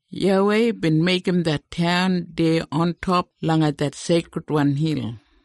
YAWEI bin meigim det taun deya ontop langa det seikridwan hil.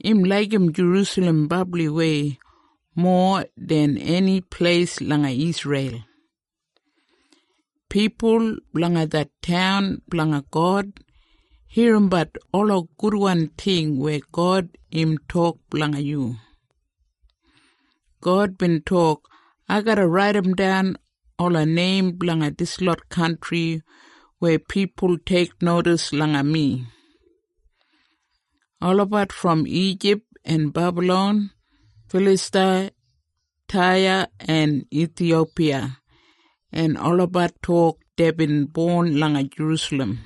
Im laigim Jerusalem brabliwei, mowa den eni pleis langa Isreil. Pipul blanga det taun blanga God, irrimbat ola gudwan ting weya God im tok blanga yu. God bin tok, “Ai garra raidimdan ola neim blanga dislot kantri weya pipul teiknodis langa mi. Olabat brom Ijip en Bebalon, Filistiya, Taya en Ithiyopiya en olabat tok deibin bon langa Jerusalem.”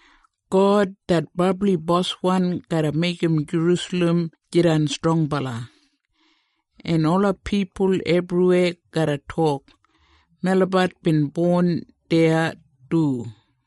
God, det Brabli Boswan, garra meigim Jerusalem jidan strongbala, en ola pipul ebriweya garra tok, “Melabat bin bon deya du.”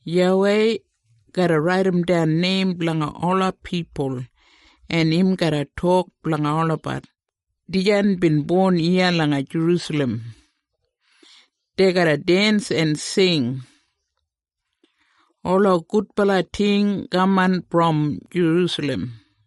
YAWEI garra raidimdan neim blanga ola pipul, en im garra tok blanga olabat, “Dijan bin bon iya langa Jerusalem.” Dei garra dens en sing, “Ola gudbala ting kaman brom Jerusalem.”